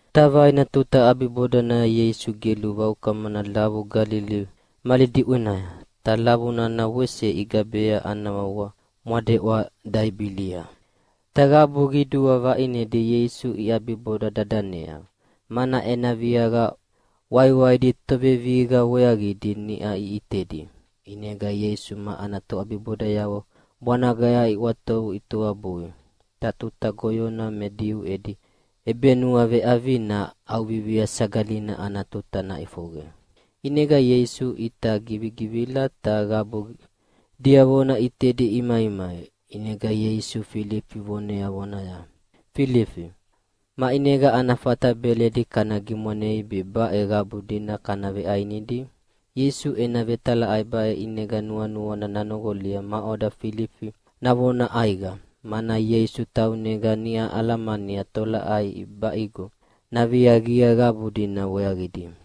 Ta vaina tuta ʼabibodanaya Ieisu gelu vaukamana lavu Galili mali diʼwenaya, ta lavu nana wese igabea ana wawa mwadeʼwa Taibilia. Ta qabu qidua vaʼinedi Ieisu iʼabiboda dadanea, mana ena viaqa waiwaidi tovevihiqa weaqidi niʼa iʼitedi. ʼInega Ieisu ma ana toʼabibodayavo bwanagaya iʼwatovu itoabui, ta tuta goyona me Diu edi ʼebenuaveʼavina ʼAuvivia Sagalina ana tuta naʼifoqe. ʼInega Ieisu ʼita givigivila ta qabu diavona ʼitedi imaimai. ʼInega Ieisu Filifi vonea vonaya, “Filifi, maʼinega ana fata beledi kana gimwanei be baʼe qabu dina kana veʼainidi?” Ieisu ena vetalaʼai baʼe ʼinega nuanuana nanoqolia maʼoda Filifi navona ʼaiqa, mana Ieisu taunega niʼa alamania tolaʼai ʼibaʼigo naviaqia qabu dina weaqidi.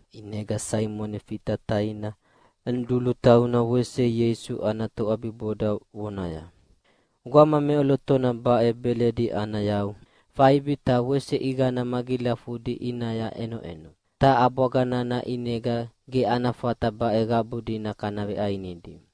ʼInega Saimoni Fita taina Anidulu tauna wese Ieisu ana toʼabiboda vonaya, “Gwama meʼolotona baʼe beledi ana yau faibi ta wese ʼiqana magilafudi ʼinaya ʼenoʼeno, ta ʼabwaga nana ʼinega ge ana fata baʼe qabu dina kana veʼainidi.”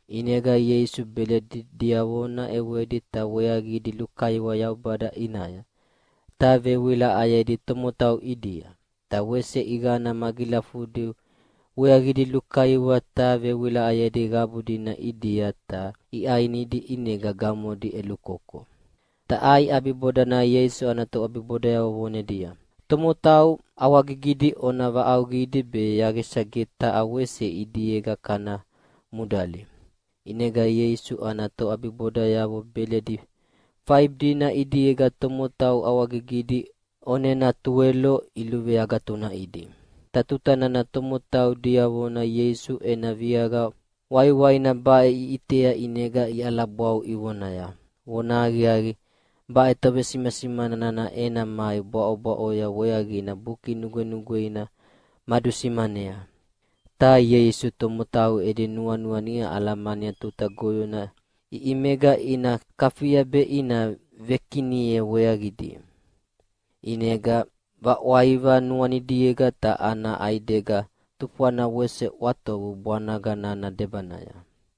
ʼInega Ieisu beledi diavona ʼewedi ta weaqidi lukaiwa Yaubada ʼinaya, ta vewilaʼayedi tomotau ʼidia. Ta wese ʼiqana magilafudi weaqidi lukaiwa ta vewilaʼayedi qabu dina ʼidia ta iʼainidi ʼinega gamodi ʼelukoko. Ta ʼai ʼabibodanaya Ieisu ana toʼabibodayavo vonedia, “Tomotau ʼawagigidi ona vaʼauqidi be yaqisa ge taha wese ʼidiega kana mudali.” ʼInega Ieisu ana toʼabibodayavo beledi faibi dina ʼidiega tomotau ʼawagigidi ʼonena tuwelo iluveagatunaʼidi. Ta tuta nana tomotau diavona Ieisu ena viaqa waiwaina baʼe iʼitea ʼinega iʼalabwau ivonaya, “Vonahaqiaqi, baʼe tovesimasimana nana ena mai bwaʼobwaʼoya weaqina Buki Nugwenugweina madusimanea.” Ta Ieisu tomotau edi nuanua niʼa alamania tuta goyona ʼiʼimega ina kafia be ina vekinia weaqidi, ʼinega vaʼwaiva nuanidiega ta ana ʼaidega tufwana wese ʼwatovu bwanaga nana debanaya.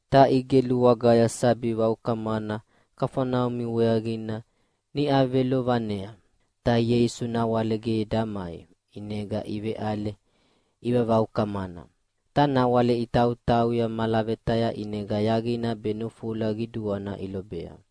ta igelu wagaya sabi vaukamana Kafaneumi weaqina. Niʼa velovanea, ta Ieisu nawale ge damai, ʼinega iveʼale ivavaukamana. Ta nawale itautauya malavetaya ʼinega yaqina be nufula qiduana ilobea.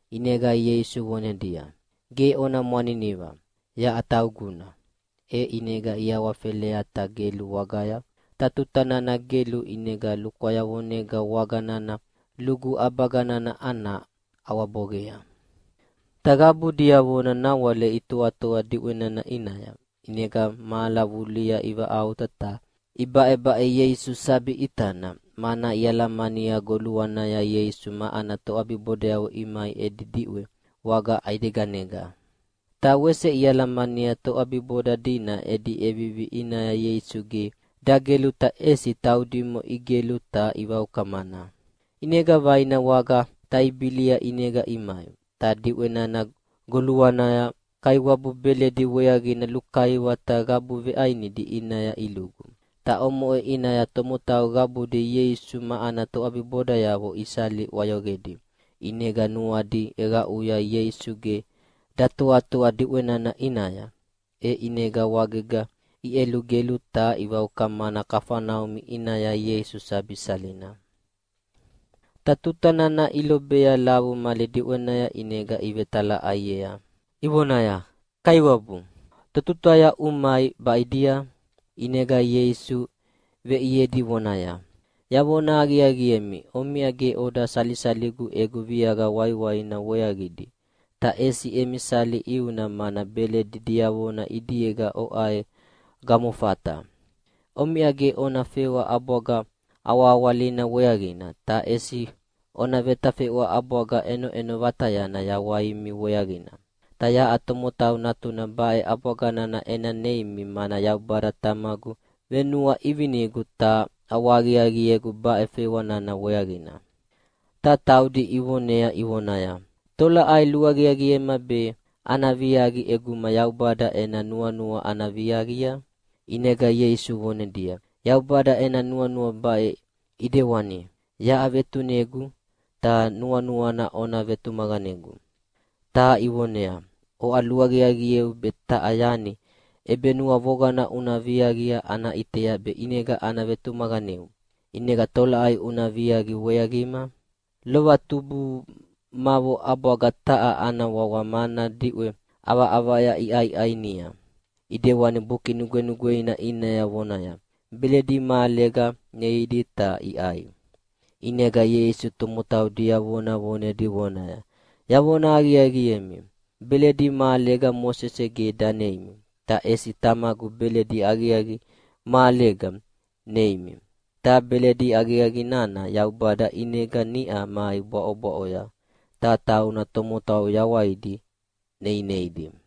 ʼInega Ieisu vonedia, “Ge ona mwaniniva! Yaʼa tauguna.” E ʼinega iawafelea ta gelu wagaya, ta tuta nana gelu ʼinega lukwayavonega waga nana lugu ʼabaga nana ana ʼawaboqea. Ta qabu diavona nawale itoatoa diʼwe nana ʼinaya. ʼInega mahala vulihia ivaʼauta ta ibaʼebaʼe Ieisu sabi ʼitana, mana ialamania goluanaya Ieisu ma ana toʼabibodayavo imai edi diʼwea waga ʼaideganega. Ta wese ialamania toʼabiboda dina edi ʼevivi ʼinaya Ieisu ge dagelu ta ʼesi taudimo igelu ta ivaukamana. ʼInega vaina waga Taibilia ʼinega imai, ta diʼwe nana goluanaya Kaiwabu beledi weaqina lukaiwa ta qabu veʼainidi ʼinaya ilugu. Ta omoʼe ʼinaya tomotau qabudi Ieisu ma ana toʼabibodayavo isali ʼwayoqedi, ʼinega nuadi ʼeqaʼuya Ieisu ge datoatoa diʼwe nana ʼinaya. E ʼinega wagega iʼelugelu ta ivaukamana Kafaneumi ʼinaya Ieisu sabi salina. Ta tuta nana ilobea lavu mali diʼwenaya ʼinega ivetalaʼaiea ivonaya, “Kaiwabu, totutaya umai baʼidia?” ʼInega Ieisu veʼiedi vonaya, “Yavona aqiaqiemi, omiʼa ge oda salisaligu egu viaqa waiwaidi weaqidi, ta ʼesi emi sali ʼiuna mana beledi diavona ʼidiega oʼai gamofata. Omiʼa ge ona fewa ʼabwaga awahawalina weaqina, ta ʼesi ona vetafeʼwa ʼabwaga ʼenoʼeno vatayana yawaimi weaqina. Ta yaʼa Tomotau Natuna baʼe ʼabwaga nana ena neimi, mana Yaubada Tamagu venuaʼivinegu ta ʼawahaqiaqiegu baʼe fewa nana weaqina.” Ta taudi ivonea ivonaya, “Tolaʼai luaqiaqiema be ana viaqi ʼeguma Yaubada ena nuanua ana viaqia?” ʼInega Ieisu vonedia, “Yaubada ena nuanua baʼe ʼidewani: Yaʼa vetunegu, ta nuanuana ona vetumaqanegu.” Ta ivoneaya, “Oʼa luaqiaqieu be taha yani ʼebenuavoqana una viaqia ana ʼitea be ʼinega ana vetumaqaneu. ʼInega tolaʼai una viaqia weaqima? Lova tubumavo ʼabwaga taha ana wawa mana diʼwe ʼavaʼavaya iʼainia, ʼidewani Buki Nugwenugweina ʼinaya vonaya, ‘Beledi mahalega neidi ta iʼai.’” ʼInega Ieisu tomotau diavona vonedi vonaya, “Yavona aqiaqiemi, beledi mahalega Mosese ge daneimi, ta ʼesi Tamagu beledi aqiaqi mahalega neineimi. Ta beledi aqiaqi nana Yaubada ʼinega niʼa mai bwaʼobwaʼoya, ta tauna tomotau yawaidi neineidi.”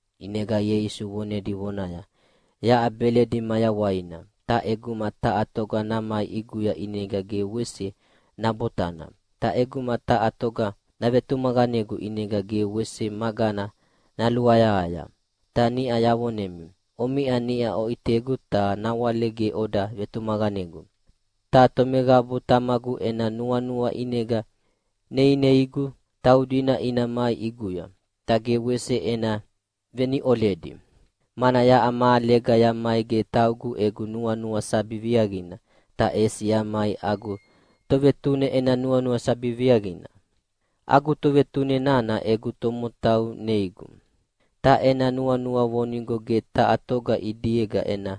ʼInega Ieisu vonedi vonaya, “Yaʼa beledi mayawaina, ta ʼeguma taha toga namai ʼiguya ʼinega ge wese nabotana, ta ʼeguma taha toga navetumaqanegu ʼinega ge wese magana naluayahaya. Ta niʼa yavonemi, omiʼa niʼa oʼitegu ta nawale ge oda vetumaqanegu. Ta tomeqabu Tamagu ena nuanua ʼinega neineigu, taudina ina mai ʼiguya, ta ge wese ena veniʼoledi. Mana yaʼa mahalega yamai ge taugu egu nuanua sabi viaqina, ta ʼesi yamai agu Tovetune ena nuanua sabi viaqina. Agu Tovetune nana egu tomotau neigu, ta ena nuanua vonigo ge taha toga ʼidiega ena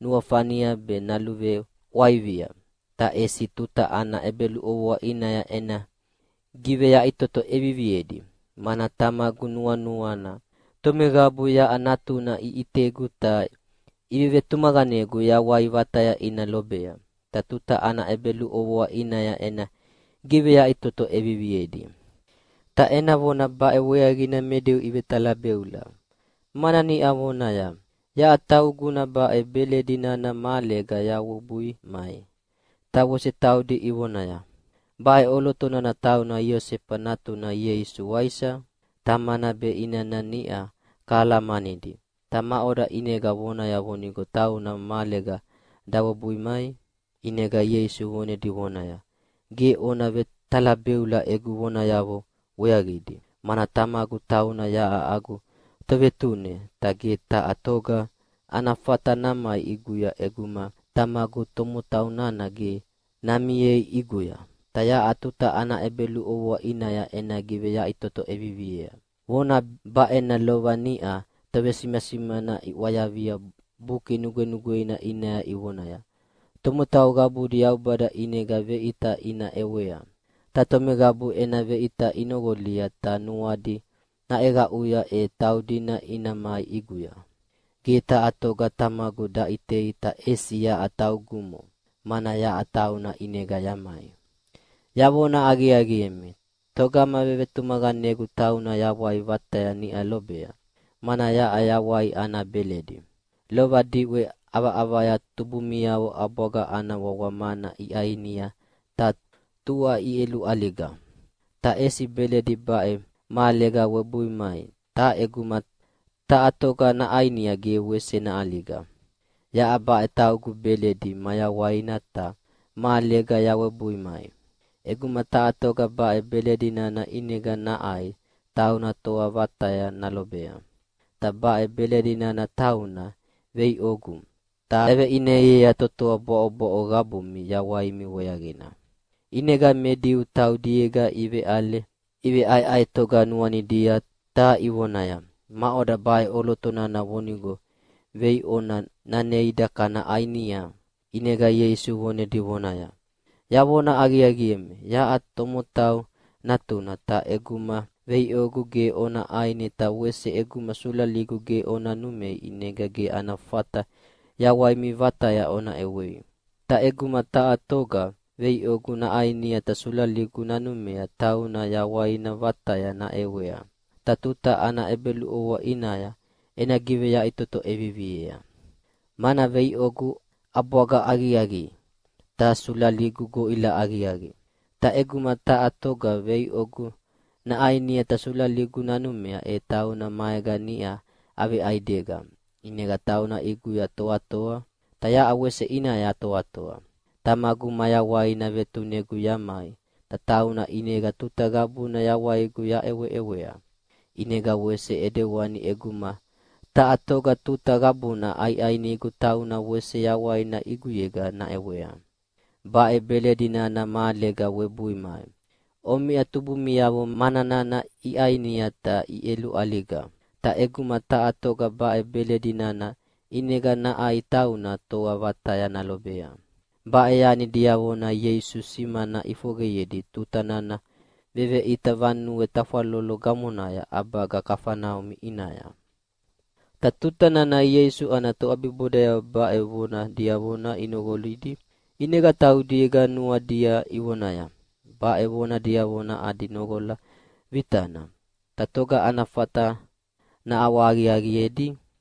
nuafania be naluveʼwaiva, ta ʼesi tuta ana ʼebeluʼovoa ʼinaya ena giveyaʼitoto ʼeviviedi. Mana Tamagu nuanuana tomeqabu yaʼa Natuna iʼitegu ta ivetumaqanegu yawai vataya ina lobea, ta tuta ana ʼebeluʼovoa ʼinaya ena giveyaʼitoto ʼeviviedi.” Ta ena vona baʼe weaqina me Diu ivetalabeula, mana niʼa vonaya, “Yaʼa tauguna baʼe beledi nana mahalega yawebui mai.” Ta wese taudi ivonaya, “Baʼe ʼoloto nana tauna Iosefa natuna Ieisu, waisa? Tamana be inana niʼa kahalamanidi, ta maʼoda ʼinega vonaya vonigo tauna mahalega dawebui mai?” ʼInega Ieisu vonedi vonaya, “Ge ona vetalabeula egu vonayavo weaqidi, mana Tamagu tauna yaʼa agu Tovetune, ta ge taha toga ana fata namai ʼiguya ʼeguma Tamagu tomotau nana ge namiei ʼiguya, ta yaʼa tuta ana ʼebeluʼovoa ʼinaya ena giveyaʼitoto ʼeviviea. Vona baʼena lova niʼa tovesimasimana iʼwayavia Buki Nugwenugweina ʼinaya ivonaya, ‘Tomotau qabudi Yaubada ʼinega veʼita ina ʼewea, ta tomeqabu ena veʼita inoqolia ta nuadi naʼeqaʼuya, e taudina ina mai ʼiguya.’ Ge taha toga Tamagu daʼitei ta ʼesi yaʼa taugumo, mana yaʼa tauna ʼinega yamai. “Yavona aqiaqiemi, togama vevetumaqanegu tauna yawai vataya niʼa lobea, mana yaʼa yawai ana beledi. Lova diʼwe ʼavaʼavaya tubumiavo ʼabwaga ana wawa mana iʼainia ta tua iʼeluʼaliga. Ta ʼesi beledi baʼe mahalega webui mai, ta ʼeguma taha toga naʼainia ge wese naʼaliga. Yaʼa baʼe taugu beledi mayawaina ta mahalega yawebui mai. ʼEguma taha toga baʼe beledi nana ʼinega naʼai tauna toa vataya nalobea. Ta baʼe beledi nana tauna veiʼogu, ta yaveʼineiea totoa bwaʼobwaʼo qabumi yawaimi weaqina.” ʼInega me Diu taudiega iveʼale iveʼaeʼaetoga nuanidia ta ivonaya, “Maʼoda baʼe ʼoloto nana vonigo veiʼona naneida kana ʼainia?” ʼInega Ieisu vonedi vonaya, “Yavona aqiaqiemi, yaʼa Tomotau Natuna, ta ʼeguma veiʼogu ge ona ʼaini ta wese ʼeguma sulaligu ge ona numei ʼinega ge ana fata yawaimi vataya ona ʼewei. Ta ʼeguma taha toga veiʼogu naʼainia ta sulaligu nanumea tauna yawaina vataya naʼewea. Ta tuta ana ʼebeluʼovoa ʼinaya ena giveyaʼitoto ʼeviviea. Mana veiʼogu ʼabwaga aqiaqi, ta sulaligu goʼila aqiaqi. Ta ʼeguma taha toga veiʼogu naʼainia ta sulaligu nanumea e tauna maega niʼa aveʼaidega, ʼinega tauna ʼiguya toatoa, ta yaʼa wese ʼinaya yatoatoa. Tamagu mayawaina vetunegu yamai, ta tauna ʼinega tuta qabuna yawaigu yaʼeweʼewea. ʼInega wese ʼidewani ʼeguma taha toga tuta qabuna ʼaiʼainigu tauna wese yawaina ʼiguyega naʼewea. Baʼe beledi nana mahalega webui mai. Omiʼa tubumiavo mana nana iʼainia ta iʼeluʼaliga. Ta ʼeguma taha toga baʼe beledi nana ʼinega naʼai tauna toa vataya nalobea.” Baʼe yani diavona Ieisu simana ʼifoqeyedi tuta nana veveʼita vanue tafwalolo gamonaya ʼabaga Kafaneumi ʼinaya. Ta tuta nana Ieisu ana toʼabibodayavo baʼe vona diavona inoqolidi, ʼinega taudiega nuanidia ivonaya, “Baʼe vona diavona adi noqola vitana, ta toga ana fata naʼawahaqiaqiedi?”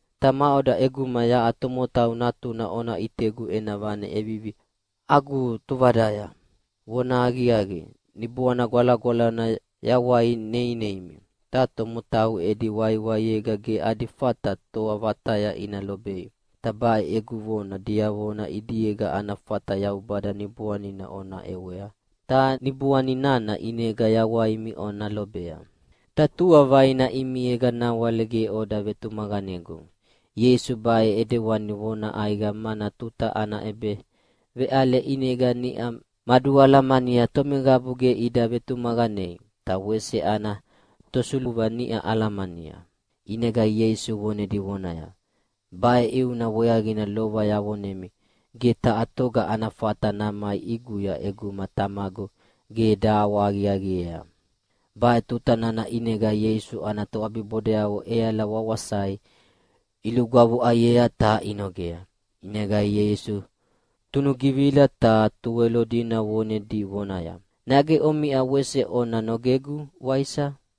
Ta maʼoda ʼeguma yaʼa Tomotau Natuna ona ʼitegu ena vane ʼevivi agu tuvadaya! Vonahaqiaqi, Niboana Gwalagwalana yawai neineimi, ta tomotau edi waiwaiega ge adi fata toa vataya ina lobei. Ta baʼe egu vona diavona ʼidiega ana fata Yaubada Niboanina ona ʼewea, ta Niboani nana ʼinega yawaimi ona lobea. Ta tua vaina ʼimiega nawale ge oda vetumaqanegu!” Ieisu baʼe ʼidewani vona ʼaiqa, mana tuta ana ʼebeveʼale ʼinega niʼa madualamania tomeqabu ge ida vetumaqanei, ta wese ana tosuluva niʼa alamania. ʼInega wese vonedi vonaya, “Baʼe ʼiuna weaqina lova yavonemi ge taha toga ana fata namai ʼiguya ʼeguma Tamagu ge daʼawahaqiaqiea.” Baʼe tuta nana ʼinega Ieisu ana toʼabibodayavo ʼeala wawasai ilugwavuʼaiea ta inogea. ʼInega Ieisu tunugivila ta Tuwelo dina vonedi vonaya, “Nage omiʼa wese ona nogegu, waisa?”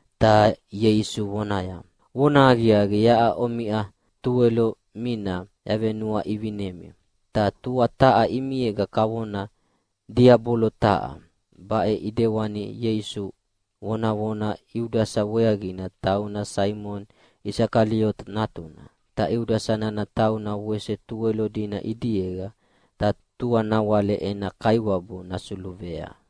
Ta Ieisu vonaya, “Vonahaqiaqi, yaʼa omiʼa Tuwelo mina yavenuaʼivinemi, ta tua taha ʼimiega kavona diabolo taha.” Baʼe ʼidewani Ieisu vonavona Iudasa weaqina, tauna Saimoni Isakaliota natuna. Ta Iudasa nana tauna wese Tuwelo dina ʼidiega, ta tua nawale ena Kaiwabu nasuluvea.